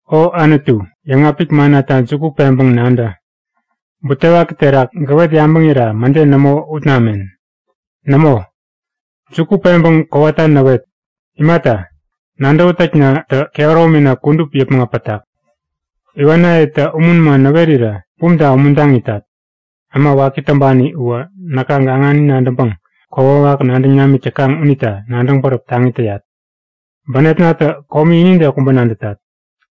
O Anutu, yäŋapik mannata juku peŋpäŋ nadä. Butewaki terak gäwet yabäŋira mäde nämo ut namen! Nämo, juku peŋpäŋ kowata näwet. Imata, nadäwätäknatä kehäromina kudup yäpmäŋ äpätak. Iwanayetä umun man näwerirä bumta umuntaŋ itat. Äma waki täŋpani uwä näka gaŋani nadäŋpäŋ kokwawak nadäŋ namik täkaŋ unita nadäŋ bäräp taŋi täyat. Bänepnatä komi inide kubä nadätat.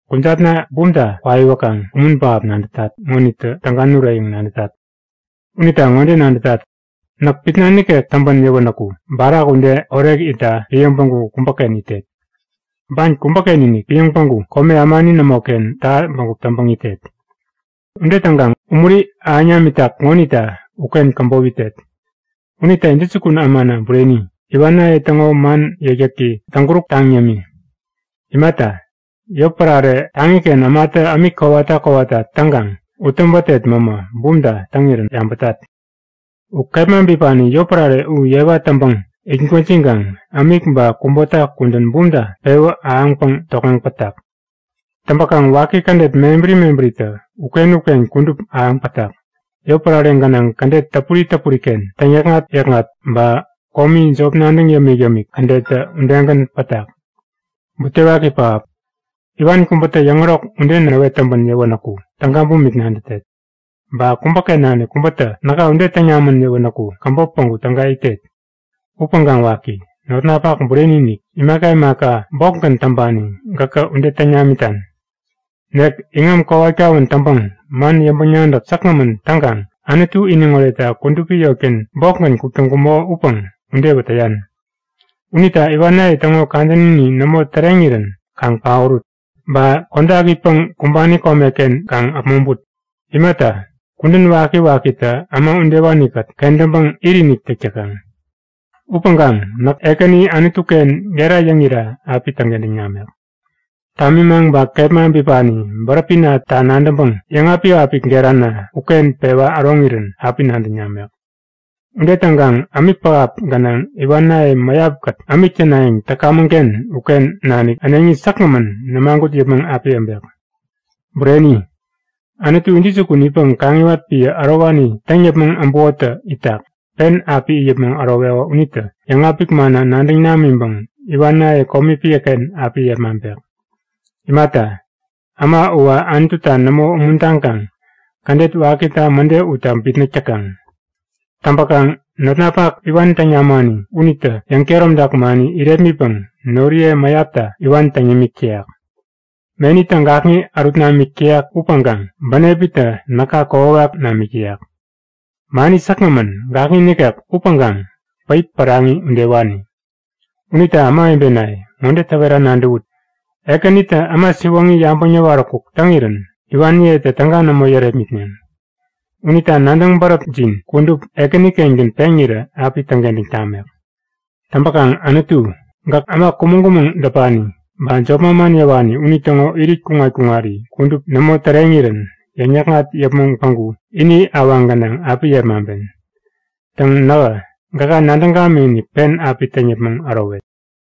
Kujatna bumta kwaiwäkaŋ umun pähap nadätat ŋonitä täga nurek yäŋ nadätat. Unita ŋode nadätat; Näk pitna nikek täŋpän yäwänäku barak ude orek itta piäŋ päŋku kubäken itet. Ban kubäken-inik piäŋ päŋku kome ämani nämoken täha bägup täŋpäŋ itet. Ude täŋkaŋ umuri ahäŋ namitak ŋonita uken käbop itet. Unita intäjukun ämana bureni, iwanaye täŋo man yäkyäki täŋ-kuruktaŋ yämi. Imata, yotpärare taŋiken ämatä ämik kowata kowata täŋkaŋ ut täpätet mämä bumta täŋirä yabätat. U kepma bipani yotpärare u yewa täŋpäŋ it gwäjiŋkaŋ ämik ba kubota kudän bumta pewä ahäŋpäŋ tokŋeŋ pätak. Täŋpäkaŋ waki kädet mebäri mebäritä uken-uken kudup ahäŋ pätak. Yotpärare gänaŋ kädet täpuri täpuriken täŋyäkŋat-yäkŋat ba komi jop nadäŋ yämik-yämik kädettä udegän pätak. Butewaki pähap! Iwan kubätä yäŋärok ude näwet täŋpän yäwänäku täga bumik nadätet. Ba kubäken nanik kubätä näka ude täŋ namän yäwänäku käbop päŋku täga itet. Upäŋkaŋ waki, notnapak bureni-inik, imaka imaka bokgän täŋpani gäkä ude täŋ namitan! Nek iŋam kowat-kawän täŋpäŋ man yäŋpäŋ-nadäk säkgämän täŋkaŋ Anutu iniŋ oretta kudupi yotken bokgän kuk täŋkumäko upäŋ udewä täyan. Unita iwanaye täŋo kadänini nämo täreŋirän kaŋ paorut! Ba kodak itpäŋ kumbani komeken kaŋ äpmoŋput! Imata, kudän wakiwakitä äma udewanikät kentäŋpäŋ it-inik täk täkaŋ. Upäŋkaŋ näk Ekäni Anutuken gera yäŋira api täŋkentäŋ namek. Tamimaŋ ba kepma bipani bäräpinata nadäŋpäŋ yäŋapik-apik gerana uken pewa äroŋirän api nadäŋ namek. Ude täŋkaŋ ämik pähap gänaŋ iwanaye mäyapkät ämik tänayäŋ täkamäŋken uken nanik äneŋi säkgämän nämagut yäpmäŋ api äbek. Bureni, Anutu intäjukun itpäŋ kaŋiwat piä ärowani täŋ yäpmäŋ äbukotä itak, pen api it yäpmäŋ äroweko unitä yäŋapik manna nadäŋ namiŋpäŋ iwanaye komi piäken api yepmaŋpek. Imata, äma uwä Anututa nämo umuntaŋkaŋ kädet wakita mäde utta bitnäk täkaŋ. Täŋpäkaŋ notnapak iwan täŋ namani unitä yäŋkehäromtak mani irepmitpäŋ noriye mäyapta iwan täŋ yämik täyak. Menitä gakŋi ärut namik täyak upäŋkaŋ bänepitä näka kokwawak namik täyak. Mani säkgämän, gakŋi nikek upäŋkaŋ päip päraŋi udewani. Unita ämawebenaye, ŋode täwera nadäwut; Ekänitä äma siwoŋi yabäŋ äwaräkuk täŋirän iwaniyetä täga nämo yärepmitneŋ. Unita nadäŋ bäräpjin kudup Ekänikengän peŋirä api täŋkentäŋ tamek. Täŋpäkaŋ Anutu, gäk äma kumäŋ-kumäŋ däpani ba jop manman yäwani unitäŋo irit kuŋat-kuŋari kudup nämo täreŋirän yäŋ-yäkŋat yäpmäŋ päŋku ini awaŋ gänaŋ api yepmaŋpen. Täŋ nähä gäka nadäŋ gamikinik pen api täŋ yäpmäŋ ärowet.